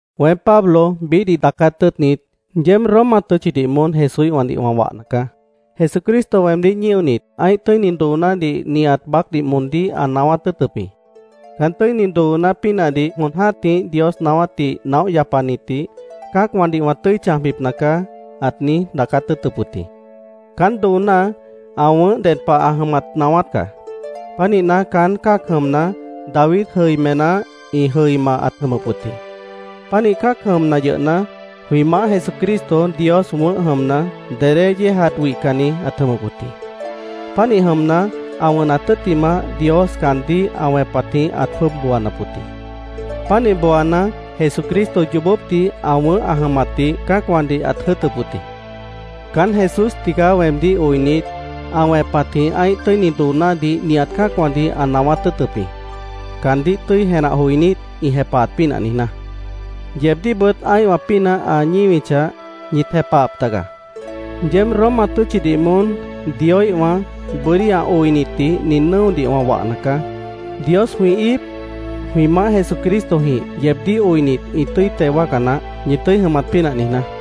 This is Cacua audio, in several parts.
Weém, Pablo biíhdih daacát tʉ́ʉtnit, yeéb Roma tʉ́tchidih moón Jesúíhwãdih wã wahna caá. Jesucristo weemdíh ñíonit, ã́ih tʉ́ini doonádih nihat baácdih moondíh ã naáwát tʉ́ʉtʉp jĩ. Caán tʉ́ini dooná pínahdih jon jã́tih Dios naáwátdih naóh yapanitdih “Cã́acwãdih wã tʉ́i chãjbipna caá”, ãt niíj daacát tʉ́ʉtʉp wʉt jĩ. Caán dooná ã wʉ̃ʉ́h ded pah ã jʉmat naáwát caá. Pánihna, caán cã́ac jʉmna, David jʉimená ĩ jʉima ãt jʉmʉp wʉt jĩ. Pánih cã́ac jʉmna yʉhna, jwĩ Maáh Jesucristo Dios wʉ̃ʉ́h jʉmna, dedé yéejat wihcanni ãt jʉmʉp wʉt jĩ. Pánih jʉmna, ã wʉnat tʉ́ttimah, Dios caandíh ã wẽpatjĩh ãt jwʉ́ʉb booanap wʉt jĩ. Pánih booana, Jesucristo yoobópdih ã wʉ̃ʉ́h ã jʉmatdih cã́acwãdih ãt jʉ́ʉtʉp wʉt jĩ. Caán Jesús tigaá weemdíh oinit, ã wẽpatjĩh ã́ih tʉ́ini doonádih nihat cã́acwãdih ã naáwát tʉ́ʉtʉp jĩ, caandíh tʉ́i jenah joinít, ĩ jepahat pínah niijná. Yeebdíhbʉt ã́ihwã pínah ã ñíwichah, ñit jepahap taga. Yeéb Roma tʉ́tchidih moón Dioíhwã, bʉ́dí ã oinitdih nin nʉ́odih wã wahna caá. Dios jwĩ íip, jwĩ Maáh Jesucristojĩh, yeebdíh oinit, ĩ tʉ́i teo wáaca naáh, ñi tʉ́i jʉmat pínah niijná.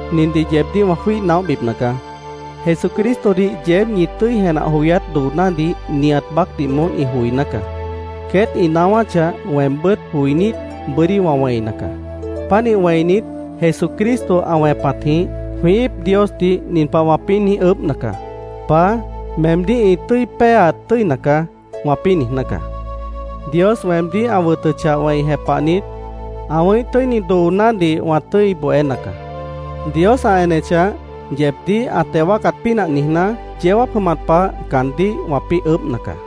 Nindih yeebdíh wã jwíih naóhbipna caá: Jesucristodih yeéb ñi tʉ́i jenah joyát doonádih nihat baácdih moón ĩ joiná caá. Queét ĩ naáwáchah, weembʉ́t joinít, bʉ́dí wã wẽina caá. Pánih wẽinit, Jesucristo ã wẽpatjĩh, jwĩ íip Diosdih nin pah wãpĩ́ niíj ʉʉ́bhna caá: “Paá, meemdíh ĩ tʉ́i péeat tʉ́ina caá”, wãpĩ́ niijná caá. Dios weemdíh ã wʉtʉchah wẽi jepahnit, ã wʉ̃ʉ́íh tʉ́ini doonádih wã tʉ́i bohéna caá. Dios ã enechah, yeebdíh ã teo wáacat pínah niijná, yeó jáap jʉmat pah caandíh wãpĩ́ ʉʉ́bhna caá.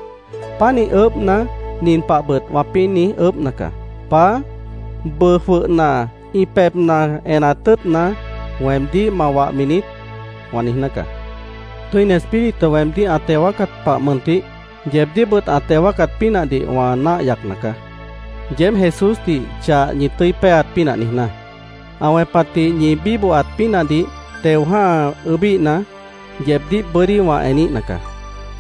Pánih ʉʉ́bhna, nin pahbʉt wãpĩ́ niíj ʉʉ́bhna caá: “Paá, ¿bʉʉ jwʉhna ĩ pebhna enat tʉ́ʉtna, weemdíh ma wahmi niít?” wã niijná caá. Tʉ́ini Espíritu weemdíh ã teo wáacat pah mʉntih, yeebdíhbʉt ã teo wáacat pínahdih wã náah yacna caá, yeéb Jesúsdih chah ñi tʉ́i péeat pínah niijná. Ã wẽpatdih ñi bíbohat pínahdih teo jã́ha ʉʉ́bíhna, yeebdíh bʉ́dí wã eníhna caá.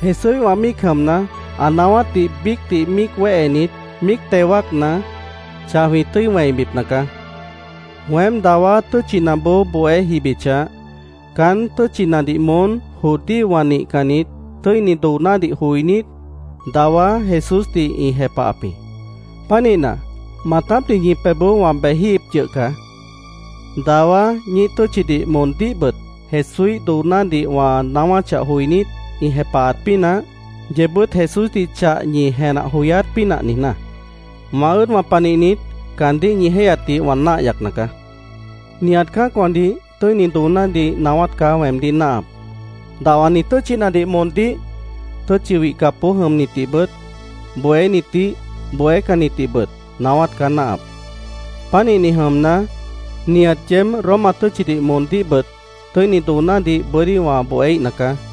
Jesúíhwã míic jʉmna, ã naáwátdih biícdih míic wéhenit, míic teo wáacna, chah jwĩ tʉ́i wẽibipna caá. Weém dawá tʉ́tchinaboó bohé jibichah, caán tʉ́tchinadih moón judíowã nihcannit tʉ́ini doonádih joinít, dawá Jesúsdih ĩ jepahap jĩ. Pánihna, maatápdih ñi pebhboó wã bejíhip yʉh caá, dawá ñíih tʉ́tchidih moondíhbʉt Jesúíh doonádih wã naáwáchah joinít, ĩ jepahat pínah, yeebbʉ́t Jesúsdih chah ñi jenah joyát pínah niijná. Wã ʉ́ʉdwã panihnit, caandíh ñi jéihyatdih wã náah yacna caá. Nihat cã́acwãdih tʉ́ini doonádih naáwát caá weemdíh náahap. Dahwani tʉ́tchinadih moondíh, tʉ́tchi wihcapboó jʉmnitdihbʉt, bohénitdih, bohécannitdihbʉt naáwát caá náahap. Pánihni jʉmna, nihat yeéb Roma tʉ́tchidih moondíhbʉt tʉ́ini doonádih bʉ́dí wã bohéíhna caá.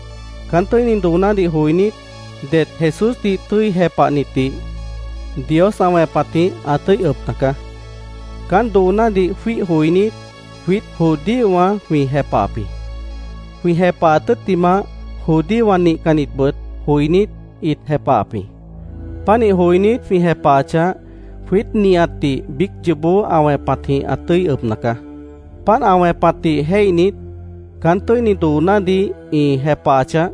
Caán tʉ́ini doonádih joinít, det Jesúsdih tʉ́i jepahnitdih Dios ã wẽpatjĩh ã tʉ́i ʉbna caá. Caán doonádih jwíih joinít, jwiít judíowã jwĩ jepahap jĩ. Jwĩ jepahat tʉ́ttimah, judíowã nihcannitbʉt joinít, ĩt jepahap jĩ. Pánih joinít, jwĩ jepahachah, jwiít nihatdih biíc yoobó ã wẽpatjĩh ã tʉ́i ʉbna caá. Páant ã wẽpatdih jéihnit, “Caán tʉ́ini doonádih ĩ jepahachah,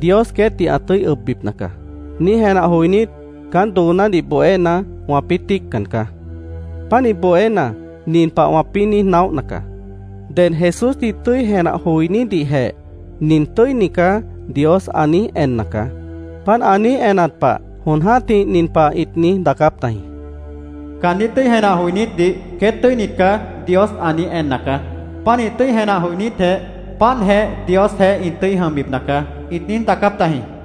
Dios queétdih ã tʉ́i ʉbbipna caá”, niíj jenah joinít, caán doonádih bohéna, wãpĩ́ tíiccan caá. Pánih bohéna, nin pah wãpĩ́ niíj naóhna caá: “Ded Jesúsdih tʉ́i jenah joinídihjeh ‘Nin tʉ́ini caá’, Dios ã niíj enna caá. Páant ã niíj enat pah, jon jã́tih nin pah ĩt niíj daacáp tajĩ: ‘Caandíh tʉ́i jenah joinítdih “Queét tʉ́init caá”, Dios ã niíj enna caá. Pánih tʉ́i jenah joinítjeh páantjeh Diosjeéh ĩ tʉ́i jʉmbipna caá’, ĩt niíj daacáp tajĩ”, wãpĩ́ niijná caá.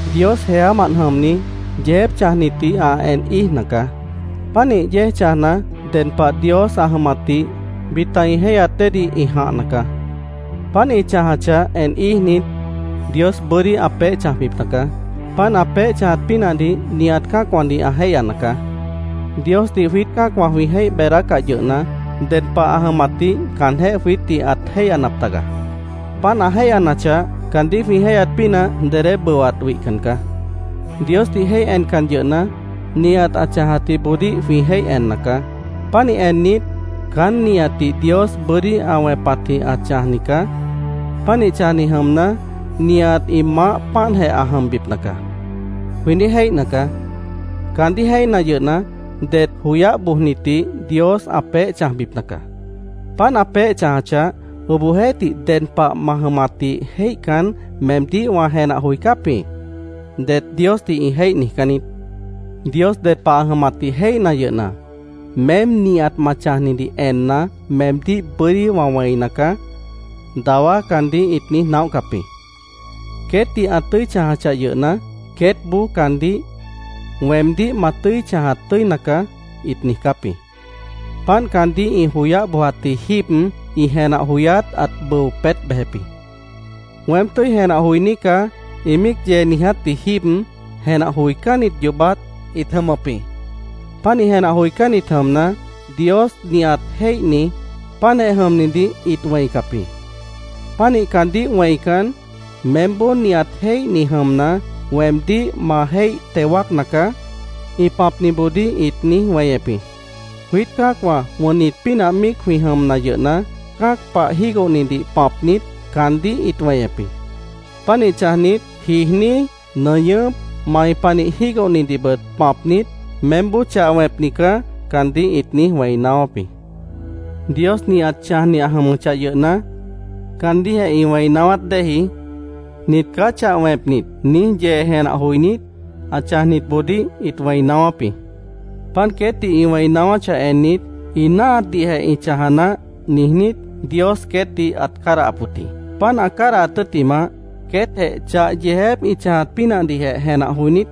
Dios jeámant jʉmni yeejép chãjnitdih ã en íijna caá. Pánih yéej chãjna, ded pah Dios ã jʉmatdih bita ĩ jéihyat déedih ĩ jãhna caá. Páant ĩ chãjachah en íijnit, Dios bʉ́dí ã peéh chãjbipna caá. Páant ã peéh chãjat pínahdih nihat cã́acwãdih ã jéihyana caá. Diosdih jwiít cã́acwã jwĩ jéih beedácah yʉhna, ded pah ã jʉmatdih caanjéh jwiítdih ãt jéihyanap taga. Páant ã jéihyanachah, caandíh jwĩ jéihyat pínah dedé bʉwat wihcan caá. Diosdih jéih encan yʉhna, nihat ã chãjatjiboodíh jwĩ jéih enna caá. Pánih ennit, “Caán nihatdih Dios bʉ́dí ã wẽpatjĩh ã chãjni caá. Pánih chãjni jʉmna, nihat ĩ maáh páantjeh ã jʉmbipna caá”, jwĩ niíj jéihna caá. Caandíh jéihna yʉhna, det joyáh bojnitdih Dios ã peéh chãjbipna caá. Páant ã peéh chãjachah, “Obohjeéhtih, ded pah ma jʉmatdih jéihcan, meemdíh wã jenah joicáp jĩ”, det Diosdih ĩ jéih niijcán niít. Dios ded pah ã jʉmatdih jéihna yʉhna, “Meém nihat ma chãjnidih enna, meemdíh bʉ́dí wã wẽina caá”, dawá caandíh ĩt niíj naóhcap jĩ. Queétdih ã tʉ́i chãjachah yʉhna, queétboó caandíh “Weemdíh ma tʉ́i chãjat tʉ́ina caá”, ĩt niijcáp jĩ. Páant caandíh ĩ joyáh bojatji jíib ĩ jenah joyát ãt bʉo peét bejep jĩ. “Weém tʉ́i jenah joiní caá”, ĩ míic yee niijátji jíib, jenah joicánnit yoobát ĩt jʉmʉp jĩ. Pánih jenah joicánnit jʉmna, Dios nihat jéihni, páantjeh jʉmnidih ĩt wẽicap jĩ. Pánih caandíh wẽican, “Meémboó nihat jéihni jʉmna, weemdíh ma jéih teo wáacna caá”, ĩ pãpniboodíh ĩt niíj weñep jĩ. Jwiít cã́acwã wʉnnit pínah míic jwĩ jʉmna yʉhna, cã́ac pah jígohnidih pãpnit, caandíh ĩt weñep jĩ. Pánih chãjnit, jiijní, nʉñʉ́p, mai panih jígohnidihbʉt pãpnit, “Meémboó chah wẽpni caá”, caandíh ĩt niíj wẽi naáwáp jĩ. Dios nihat chãjni ã jʉmʉchah yʉhna, caandíhjeh ĩ wẽi naáwát déeji, “Nit caá chah wẽpnit”, niíj yee jenah joinít, ã chãjnitboodíh ĩt wẽi naáwáp jĩ. Páant queétdih ĩ wẽi naáwáchah ennit, “Ĩ náahatdihjeh ĩ chãja naáh”, niijnít, Dios queétdih ãt cádahap wʉt jĩ. Páant ã cádahat tʉ́ttimah, queétjeh chah yeejép ĩ chãjat pínahdihjeh jenah joinít,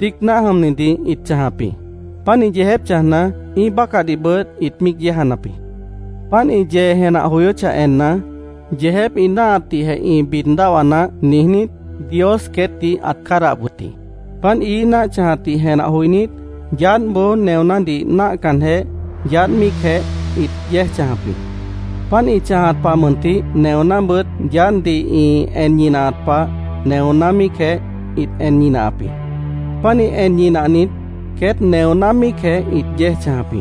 tíic náah jʉmnidih ĩt chãjap jĩ. Pánih yeejép chãjna, ĩ́ih bácahdihbʉt ĩt míic yéejanap jĩ. Páant ĩ yee jenah joyóchah enna, “Yeejép ĩ náahatdihjeh ĩ bid dáhwa naáh”, niijnít, Dios queétdih ãt cádahap wʉt jĩ. Páant ií náah chãjatdih jenah joinít, yaádhboó neonádih náahcanjeh, yaádh míicjeh ĩt yéej chãjap jĩ. Páant ĩ chãjat pah mʉntih, neonábʉt yaádhdih ĩ en ñinahat pah neoná míicjeh ĩt en ñinahap jĩ. Pánih en ñinahnit, queét neoná míicjeh ĩt yéej chãjap jĩ.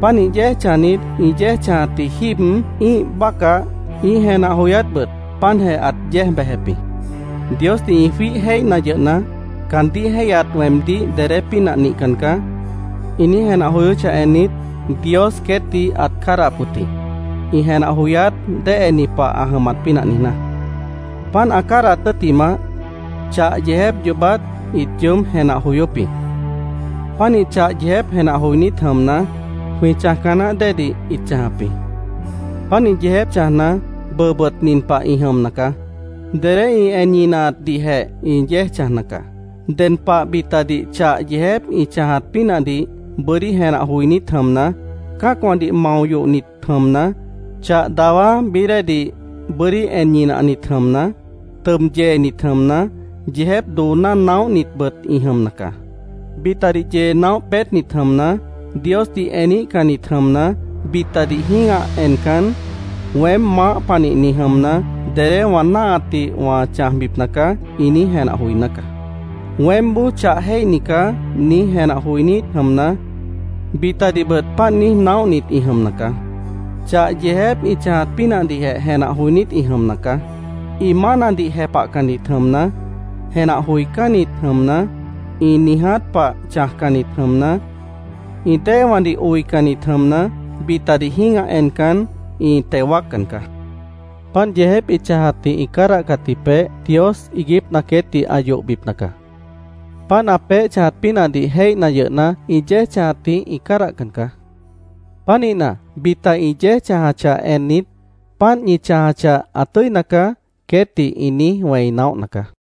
Pánih yéej chãjnit, ĩ yéej chãjatji jíib ĩ́ih bácah, ĩ́ih jenah joyátbʉt páantjeh ãt yéej bejep jĩ. Diosdih ĩ jwíih jéihna yʉhna, “Caandíh jéihyat weemdíh dedé pínah nihcan caá”, ĩ niíj jenah joyóchah ennit, Dios queétdih ãt cádahap wʉt jĩ, ĩ jenah joyát déheni pah ã jʉmat pínah niijná. Páant ã cádahat tʉ́ttimah, chah yeejép yoobát ĩt yoób jenah joyóp jĩ. Pánih chah yeejép jenah joinít jʉmna, jwĩ chãjca naáh déedih ĩt chãjap jĩ. Pánih yeejép chãjna, bʉʉbʉt nin pah ĩ jʉmna caá: Dedé ĩ en ñinahatdihjeh ĩ yéej chãjna caá. Ded pah bitadih chah yeejép ĩ chãjat pínahdih bʉ́dí jenah joinít jʉmna, cã́acwãdih mao yohnit jʉmna, chah dawá bií déedih bʉ́dí en ñinahnit jʉmna, tʉb yeenit jʉmna, yeejép dooná naóhnitbʉt ĩ jʉmna caá. Bitadih yee naóh peétnit jʉmna, Diosdih eníhcannit jʉmna, bitadih jĩ́gah encan, “Weém maáh panihni jʉmna, dedé wã náahatdih wã chãjbipna caá”, ĩ niíj jenah joiná caá. “Weémboó chah jéihni caá”, niíj jenah joinít jʉmna, bitadihbʉt páant niíj naóhnit ĩ jʉmna caá. Chah yeejép ĩ chãjat pínahdihjeh jenah joinít ĩ jʉmna caá. Ĩ mánadih jepahcannit jʉmna, jenah joicánnit jʉmna, ĩ niiját pah chãjcannit jʉmna, ĩ déewãdih oicannit jʉmna, bitadih jĩ́gah encan, ĩ teo wáaccan caá. Páant yeejép ĩ chãjatdih ĩ cádahcatji peéh Dios iiguípna queétdih ã yohbipna caá. Páant ã peéh chãjat pínahdih jéihna yʉhna, ĩ yéej chãjatdih ĩ cádahcan caá. Pánihna, bita ĩ yéej chãjachah ennit, “Páant ñi chãjachah, ã tʉ́ina caá”, queétdih ĩ niíj wẽi naóhna caá.